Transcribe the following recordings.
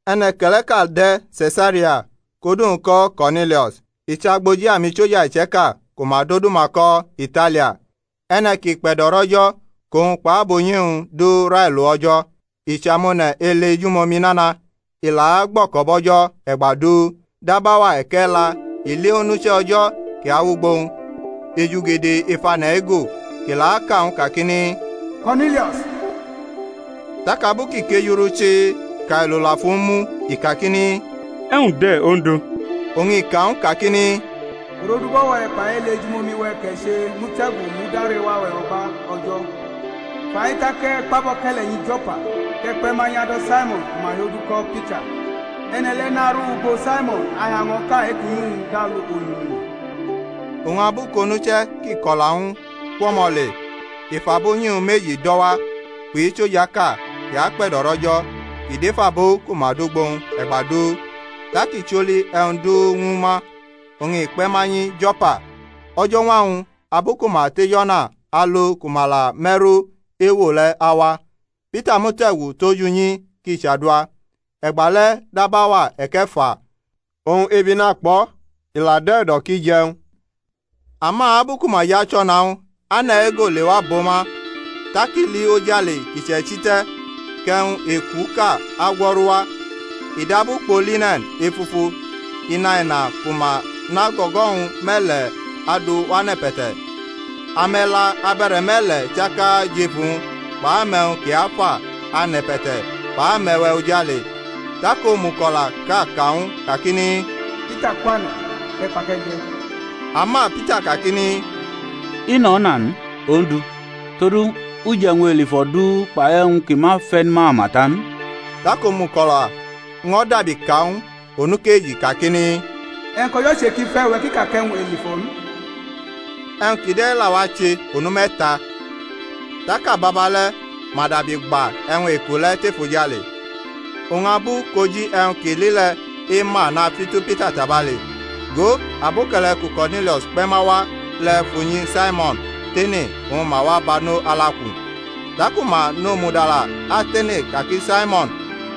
E̩ne̩ke̩le̩ʼka la de̩ Se̩saria kʼodu-wñ ko̩ Ko̩rnilio̩s, i chʼagboji amisoja iche̩ka ku ma dʼodu-ma ko̩ Italia. E̩ne̩ kʼi kpe̩do̩rʼO̩jo̩ kʼowñ kpʼabunyi-wñ du railo O̩jo̩, i achʼamone̩ ele ejumomi nana, i la agbo̩ko̩bo̩ O̩jo̩ e̩gba du. Dab auwa e̩ke̩la i li onuche̩ O̩jo̩ kʼi awʼugbo-wñ ejugede ef ane̩ ego, kʼi la aka ñw u kakini, Ko̩rnilio̩s. Tak abu kʼi kejurʼu chii kʼailo la fʼu mu i kakini, E̩wñ de̩, Ondu? Oñ i ka ñw u kakini, Urodubo̩-we̩ kpai ele ejumomi-we̩ kʼe̩ che mute̩gu mud arewa-we̩ o̩gba O̩jo̩. Fai tak e̩ kpʼaboke̩le̩ nyi Jo̩pa, kʼe̩ kpe̩ ma nyʼado̩ Saimo̩n ku ma hiodu ko̩ Pita. E̩ne̩ le̩ naru ugbo Saimo̩n ahiaño̩ʼka e-kʼunyi-wñ dʼalu ohimini. Oñ abu kʼonuche̩ kʼi ko̩la ñw u kwʼo̩mo̩ le, i fʼabunyi-wñ meji do̩ wa kpʼisojaʼka kʼi akpe̩do̩rʼO̩jo̩ kʼi dʼef abo ku ma dʼugbo-wñ e̩gba du, Tak i choli e̩wñ du ñwu ma, oñ i kpe̩ ma nyi Jo̩pa. O̩jo̩ñwa-wñ abu ku ma tʼej o̩na alo ku ma la me̩ru ewo le̩ awa, Pita mute̩gu tʼoj unyi kʼi chadua, e̩gba le̩ dab auwa e̩ke̩fa. Oñ ebi nakpʼo̩, i dʼe̩ e̩do̩ kʼi je̩ e̩wñ. Ama abu ku ma jʼachʼo̩na-wñ ane̩ ego lewa bʼo ma. Tak i li ojale kʼi che̩chi te̩, kʼe̩wñ ekuʼka agwo̩ru wa, i dab ukpo line̩n efufu inaina ku ma nʼago̩go̩-wñ me̩le̩ adu wʼane̩pe̩te̩. Ame̩la abe̩re̩me̩le̩ chaka jʼef uwñ kpʼame̩wñ ki afa ane̩pe̩te̩ kpʼame̩we̩ ojale. Tak omuko̩laʼka ka ñw u kakini, Pita kwane̩, kʼe̩ kpa, kʼe̩ je̩. Ama Pita kakini, I nʼo̩na n, Ondu; todu, u je̩ e̩wñ elifo̩ du kpai e̩wñ ki ma fe̩ n mama ta n. Tak omuko̩la ño̩ dabi ka ñw u onukeji kakini, E̩wñ kʼO̩jo̩ che ki fe̩ uwe̩ ki ka kʼe̩wñ elifo̩ n. E̩wñ kide̩ la wache onu me̩ta, tak ababa le̩ ma dabi gba e̩wñ eku le̩ tʼefojale. Oñ abu kʼoji e̩wñ kʼi li le̩ ema nañtu Pita tabale, go, aboke̩le̩ ku Ko̩rnilio̩s kpe̩ ma wa le̩ fʼunyi Saimo̩n tene oñ ma wa bano alaku. Taku ma nʼomudala atene ka ki Saimon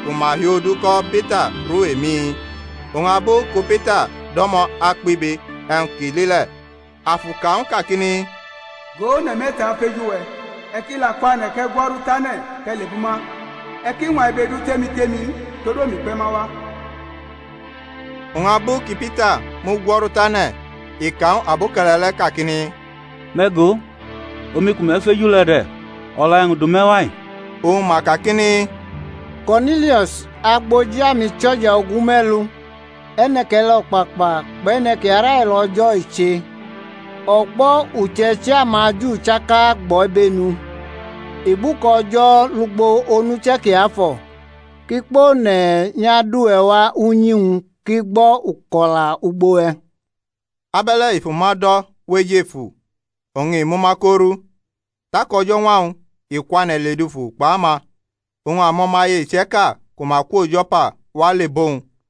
ku ma hiodu ko Pita ru emi? Oñ abu ku Pita do̩mo̩ akpibe e̩wñ kʼi li le̩, Afu ka ñw u kakini, Go, one̩ me̩ta afeju we̩. E̩ ki la kwane̩, kʼe̩ gwo̩ru tane̩ kʼe̩ lebʼuma, e̩ ki ñwa ibe du tʼemi tʼemi n, todu omi kpe̩ ma wa. Oñ abu kʼiPita mugwo̩ru tane̩ i ka ñw aboke̩le̩ le̩ kakini, Me̩ go, omi ku me̩ feju le̩ de̩; o̩la e̩wñ du me̩ wa-i? Oñ ma kakini, Ko̩rnilio̩s agboji amisoja ogume̩lu, e̩ne̩ke̩le̩ o̩kpakpa kpʼe̩ne̩ kʼi arailo O̩jo̩ i che, o̩gbo̩ uche̩ichi amaJu chaka agbʼo̩ ibenu, i gbʼuka O̩jo̩ lugbo onuche̩ kiafo̩, kʼi kpʼone̩ nyʼado̩ uwe̩ wa unyi-wñ, kʼi gbo̩ uko̩la ugbo we̩. Abe̩le̩ i fʼuma do̩ wʼejefu oñ i mʼuma ko ru. Tak o̩jo̩ñwa-wñ i kwane̩ ledufu kpʼama, oñ amo̩maye iche̩ka ku ma kwo Jo̩pa wa le bʼowñ.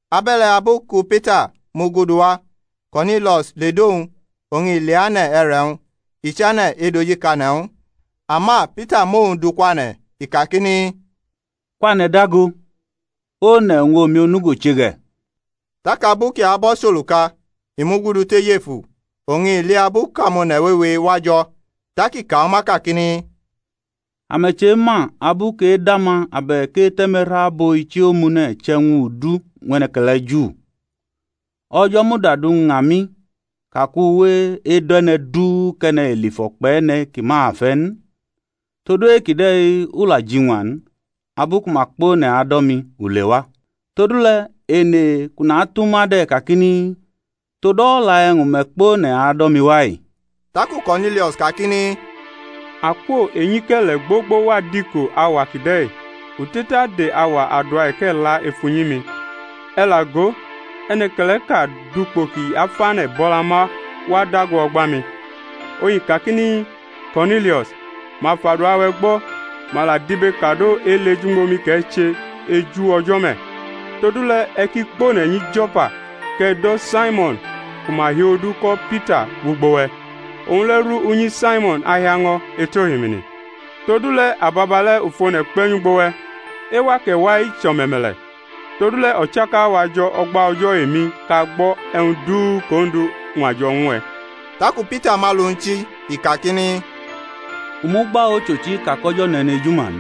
Abe̩le̩ abu ku Pita mugudu wa, Ko̩rnilio̩s ledʼowñ oñ i leane̩ e̩re̩-wñ, i chane̩ edojikane̩ ñw u. Ama Pita mʼowñ du kwane̩, i kakini, Kwane̩ dago, one̩ oñ omi onugo che ge̩. Tak abu kʼi abʼo̩ choluka i mugudu tʼejefu, oñ i li abu kʼamone̩ wewe wa jo̩. Tak i ka ñw ma kakini, Ame̩ chema abu kʼedama abe̩k ete̩me̩ru abo ichi omune̩ chʼe̩wñ udu ñw e̩ne̩ke̩le̩ Ju. O̩jo̩ muda duña mi ka kʼu we edo̩ e̩ne̩ du kʼe̩ne̩ elifo̩ kpʼe̩ne̩ ki ma fe̩ n. Todu e-kide̩ u la jiñwa n, abu ku ma kpʼone̩ ado̩ mi, u lewa. Todule̩ ene kʼu natʼuma de̩ kakini, Tod o̩la e̩wñ me̩ kpʼone̩ ado̩ mi wa-i? Taku Ko̩rnilio̩s kakini, Akwo enyike̩le̩ gbogbo wʼadiko auwa kide̩-i u te̩tade auwa adua e̩ke̩la ef unyi-mi; e̩ la go, e̩ne̩ke̩le̩ʼka dʼukpo ki afane̩ bʼo̩la ma wa dago o̩gba-mi. Oñ i kakini, Ko̩rnilio̩s, ma fʼadua-we̩ gbo̩, ma la dibekado ele ejumomi kʼe̩ che eju O̩jo̩ me̩. Todule̩ e̩ ki kpʼone̩ nyi Jo̩pa kʼe̩ do̩ Saimo̩n ku ma hiodu ko̩ Pita wʼugbo we̩; owñ le̩ ru unyi Saimo̩n ahiaño̩ etʼohimini. Todule̩ ababale̩ u fʼone̩ kpe̩ nyʼugbo we̩; ewa kʼe̩ wa-i, chʼo̩me̩me̩le̩. Todule̩ o̩chaka-wa jo̩ o̩gba O̩jo̩ emi kʼa gbo̩ e̩wñ du kʼOndu ñwajo̩ ñw e̩. Taku Pita mʼalu-wñ chi, i kakini, U mugba ochochi ka kʼO̩jo̩ nʼe̩nejuma n,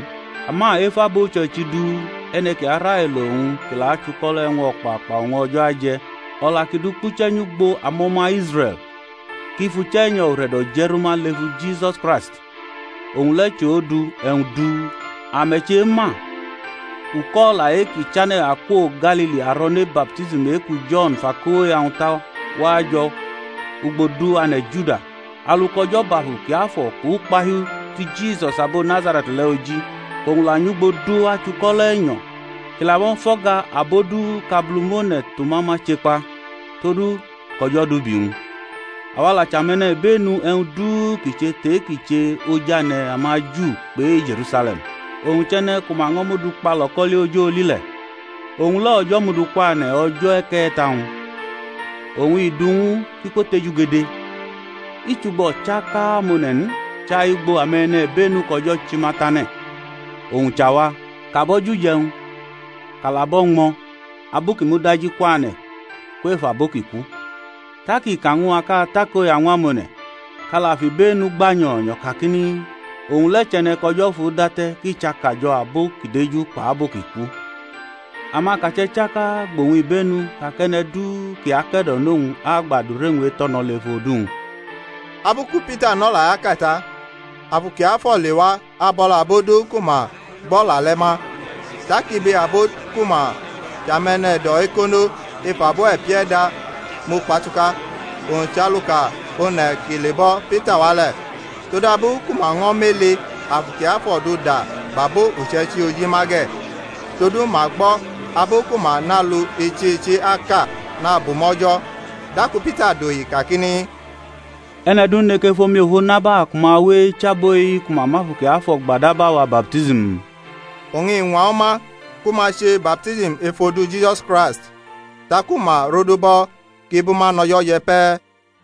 ama ef abo uche̩ichi du e̩ne̩ kʼi arailo owñ kʼi la achuko̩lo̩ e̩wñ o̩kpakpa oñ O̩jo̩ aje̩. O̩la kʼi du kpuche̩ nyʼugbo amo̩ma Israe̩l, kʼi fʼUche̩nyo̩ ure̩do̩ je̩ rʼuma lefu Jisusi Kraist (owñ le̩ chʼOndu e̩wñ du); ame̩ chema, uko̩la kʼi chane̩ akwo Galili aro̩ne baptism e-ku Jo̩n fʼakoya-wñ ta wajo̩ ugbo du ane̩ Juda; alu kʼO̩jo̩ bʼAfu Kiafo̩ kpʼukpahiu ti Jisus abo Nazare̩t le̩ oji, kʼowñ la nyʼugbo du achuko̩lo̩ e̩nyo̩, kʼi laño̩ fʼo̩ga abo du kʼAbulumone̩ tʼuma ma chekpa, todu kʼO̩jo̩ dʼubi-wñ. Awa la chʼame̩nibenu e̩wñ du kʼi che tʼe-kʼi che oj ane̩ amaju kpʼe-Je̩rusale̩m; owñ chʼe̩ne̩ ku ma ño̩ mudu kpa lo̩ko̩li oj oli le̩. Owñ le̩ O̩jo̩ mudu kwane̩ o̩jo̩ e̩ke̩ta-wñ, oñ i du ñw u kʼi kwotejugede, i chʼugbo o̩chaka amone̩ n, chai ugbo ame̩nibenu kʼO̩jo̩ chi ma tane̩, owñ chʼawa, kʼa bʼo̩ jʼuje̩wñ kʼa la bʼo̩ ñmo̩ abu kʼi mudajikwane̩ kwef abo ki ku. Tak i ka ñw a kʼa takoya ñw amone̩, kʼa la fʼibenu gba nyo̩nyo̩ kakini, Owñ le̩ chʼe̩ne̩ kʼO̩jo̩ fudate̩ kʼi chʼakajo̩ abo ki deju kpʼabo ki ku. Amakache̩ chaka gbʼowñ ibenu ka kʼe̩ne̩ du kʼi ake̩do̩nʼowñ agba adure-wñ eto̩no̩ lef odu-wñ. Abu ku Pita nʼo̩la-i aka ta, Afu Kiafo̩ lewa abʼo̩la abo du ku ma gbʼo̩la le̩ ma. Tak ibe abo ku ma chʼame̩ne̩do̩-ekono ef abo e̩pie̩da mu-kpatuka, owñ chʼaluka one̩ ki lebo̩ Pita wa le̩, todabu ku ma ño̩ mʼele Afu Kiafo̩ du da bʼabo uche̩ichi oji ma ge̩: todu ma gbo̩ abu ku ma nʼalu ichi ichi aka ku ma la nabumʼO̩jo̩. Taku Pita dohi kakini, E̩ne̩ du neke fʼomifo naba ku ma we̩ eche abo-i ku ma mʼAfu Kiafo̩ gba dab awa baptism? Oñ i ñwa ñwu ma ku ma che baptism ef odu Jisus Kraist. Taku ma rodubʼo̩ kʼi bʼuma nʼo̩jo̩ je̩ pe̩.